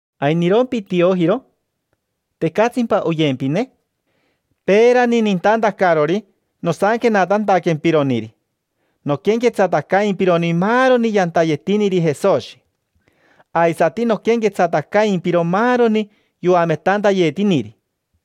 ¿Ainirompi Tiojiro? ¿Tecatsimpa oyempine? Peerani nintantacarori nosanquenatantaquempironiri, noquenquetsatacaimpironi maaroni yantayetiniri Jesoshi. Aisati noquenquetsatacaimpiro maaroni yoametantayetiniri.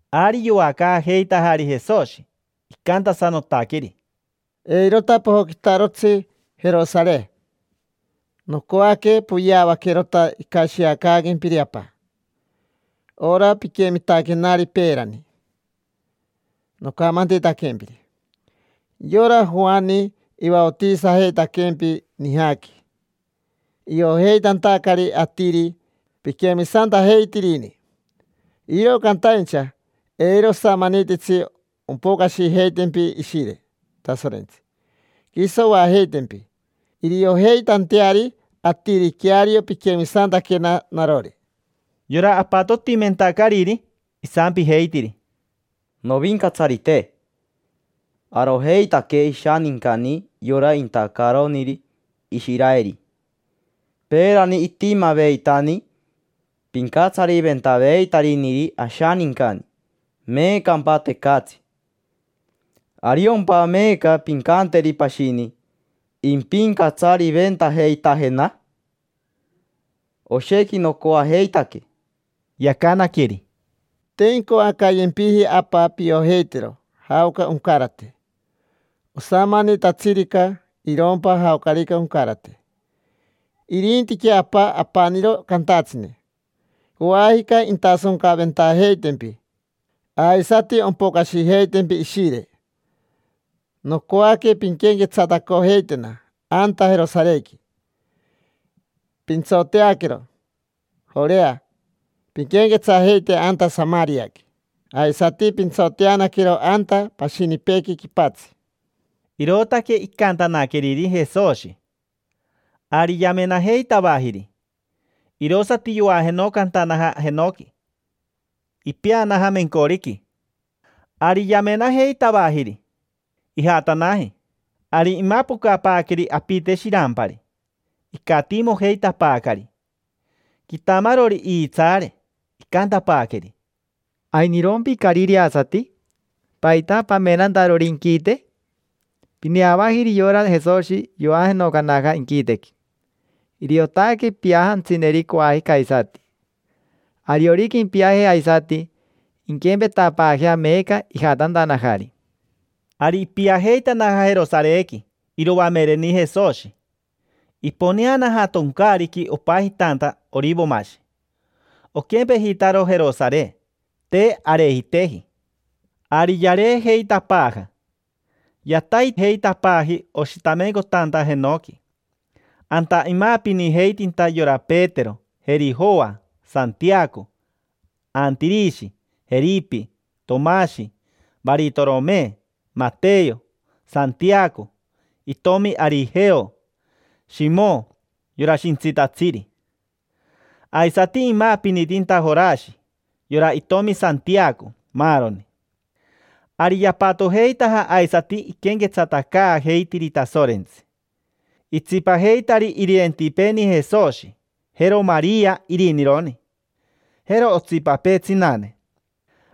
Ari yoacaajeitajari Jesoshi. Icantasanotaqueri: —Eirota pojoquitarotsi Jerosare; nocoaque poyeavaquerota icashiacaaquempiri Apa: ora piquemitaquenari peerani nocamantitaquempiri. Yora Joani ivaotisajeitaquempi nijaqui iojeitantacari atiri piquemisantajeitirini. Iro cantaincha eiro osamanititsi ompocashijeitempi Ishire Tasorentsi, quiso oajeitempi iriojeitanteari atiri queario piquemisantaquena narori. Yora apatotimentacariri, isampijeitiri: —Novincatsarite. Arojeitaque ishanincani yora intacaroniri Ishiraeri. Peerani itimaveitani pincatsariventaveitariniri ashanincani; meecampa, tecatsi. ¿Ariompa meeca pincanteri pashini impincatsariventajeitajena? Oshequi nocoajeitaque. Yacanaqueri: —Te incoacayempiji Apa piojeitero jaoca oncarate. Osamanitatsirica, irompa jaocarica oncarate. Irintiquea Apa apaniro cantatsine. Coajica intasoncaventajeitempi, aisati ompocashijeitempi Ishire. Nocoaque pinquenquetsatacojeitena anta Jerosarequi, pintsoteaquero Jorea. Pinquenquetsajeite anta Samariaqui, aisati pintsoteanaquero anta pashinipeequi quipatsi. Irootaque icantanaqueriri Jesoshi. Ari yamenajeitavajiri, irosati yoajenocantanaja jenoqui, ipeanaja mencoriqui. Ari yamenajeitavajiri sorerere, ijatanaji. Ari imapocapaaqueri apite shirampari, icatiimojeitapaacari. Quitamarori iitsaare. Icantapaaqueri: —¿Ainirompi, carireasati? ¿Paita pamenantarori inquite? Pineavajiri yora Jesoshi yoajenocanaja inquitequi. Iriotaque piajantsineri coajica aisati. Ariorica impiaje aisati, inquempetapaajea meeca ijatantanajari. Ari ipiajeitanaja Jerosarequi iroamereni Jesoshi. Iponeanaja toncaariqui opajitanta Orivomashi. Oquempejitaro Jerosare, te arejiteji. Ari yareejeitapaaja, yataijeitapaaji oshitamencotanta jenoqui. Anta imaapinijeitinta yora Petero, jeri Joa, Santiaco, Antirishi, Jeripi, Tomashi, Varitorome, Mateyo, Santiaco itomi Arijeo, Shimo yora Shintsitatsiri. Aisati imaapinitinta Jorashi, yora itomi Santiaco, maaroni. Ari yapatojeitaja aisati iquenquetsatacaajeitiri Tasorentsi. Itsipajeitari irirentipeeni Jesoshi, jero Maria irinironi, jero otsipapee tsinane.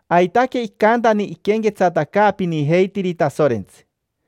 Aitaque icantani iquenquetsatacaapinijeitiri Tasorentsi.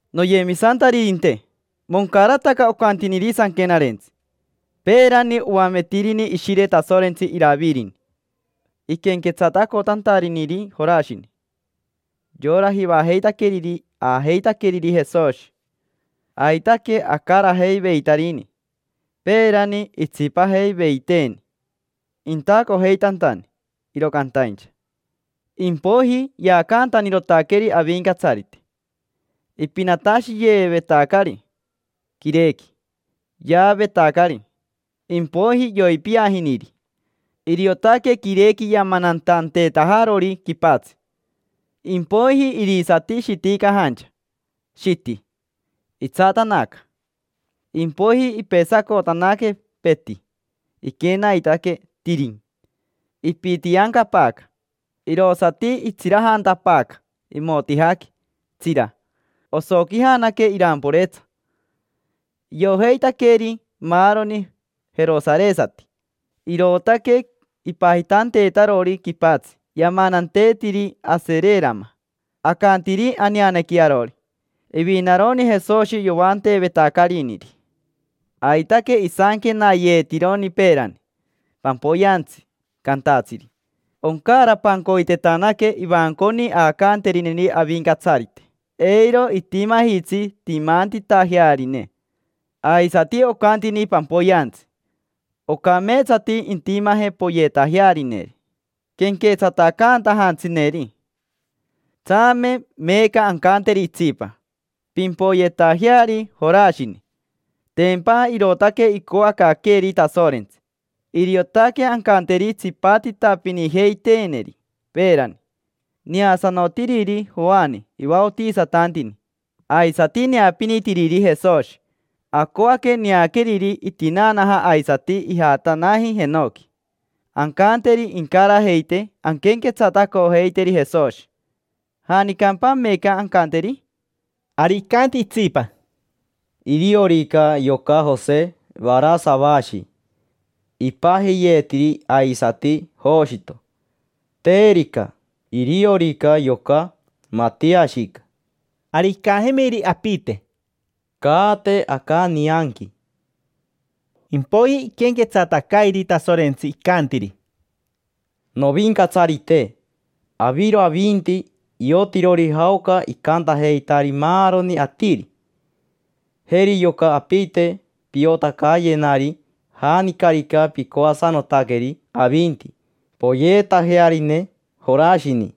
—Noyemisantaririnte, moncarataca ocantiniri Sanquenarentsi. Peerani oametirini Ishire Tasorentsi Iravirini iquenquetsatacotantariniri Jorashini: yora jivajeitaqueriri aajeitaqueriri Jesoshi. Aitaque acarajeiveitarini. Peerani itsipajeiveiteeni intacojeitantani, iro cantaincha impoiji yaacantanirotaqueri Avincatsarite, ipinatashiyeevetacari quirequi. Yaavetacari, impoiji yoipiajiniri, iriotaque quirequi yamanantanteetajarori quipatsi. Impoiji irisati shiticajancha, shiti; itsatanaca. Impoiji ipesacotanaque, peti; iquenaitaque tirin; ipitiancapaaca; irosati itsirajantapaaca imotijaqui, tsira, osoquijanaque iramporetsa. Iojeitaqueri maaroni jerosaresati. Irootaque ipajitanteetarori quipatsi yamananteetiri Asererama. Acantiri aneanequi arori: “Ivinaroni Jesoshi yoanteevetacariniri”. Aitaque isanquenayeetironi peerani pampoyeantsi cantatsiri: “Oncaarapancoitetanaque ivanconi aacanterineri Avincatsarite, eiro itimajitsi timantitajearine”. Aisati ocantini pampoyeantsi: “Ocameetsati intimaje poyeetajearineri quenquetsatacantajantsineri”. Tsame meeca ancanteri itsipa: “Pimpoyeetajeari Jorashini”: tempa irootaque icoacaaqueeri Tasorentsi. Iriotaque ancanteri tsipatitapinijeiteeniri peerani: neasanotiriri Joani ivaotisatantini, aisati neapinitiriri Jesoshi. Acoaque neaqueriri itinaanaja aisati ijatanaji jenoqui: ancanteri incarajeitee anquenquetsatacojeiteri Jesoshi. ¿Janicampa meeca ancanteri? Ari icanti itsipa: —Iriorica yoca Jose Varasavashi, ipajiyeetiri aisati Joshito. Terica, iriorica yoca Matiashica. Ari icajemiri apite: —Caate aca nianqui. Impoiji iquenquetsatacairi Tasorentsi, icantiri: —Novincatsarite, aviro avinti iotirori jaoca icantajeitari maaroni atiri. Jeri yoca apite. Piotacayenari janicarica picoasanotaqueri avinti poyeetajearine Jorashini.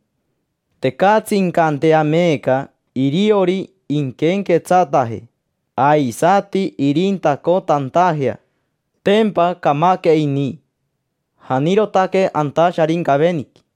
Tecatsi incantea meeca iriori inquenquetsataje aisati irintacotantajea: tempa camaque ini, janirotaque anta Sharincaveniqui.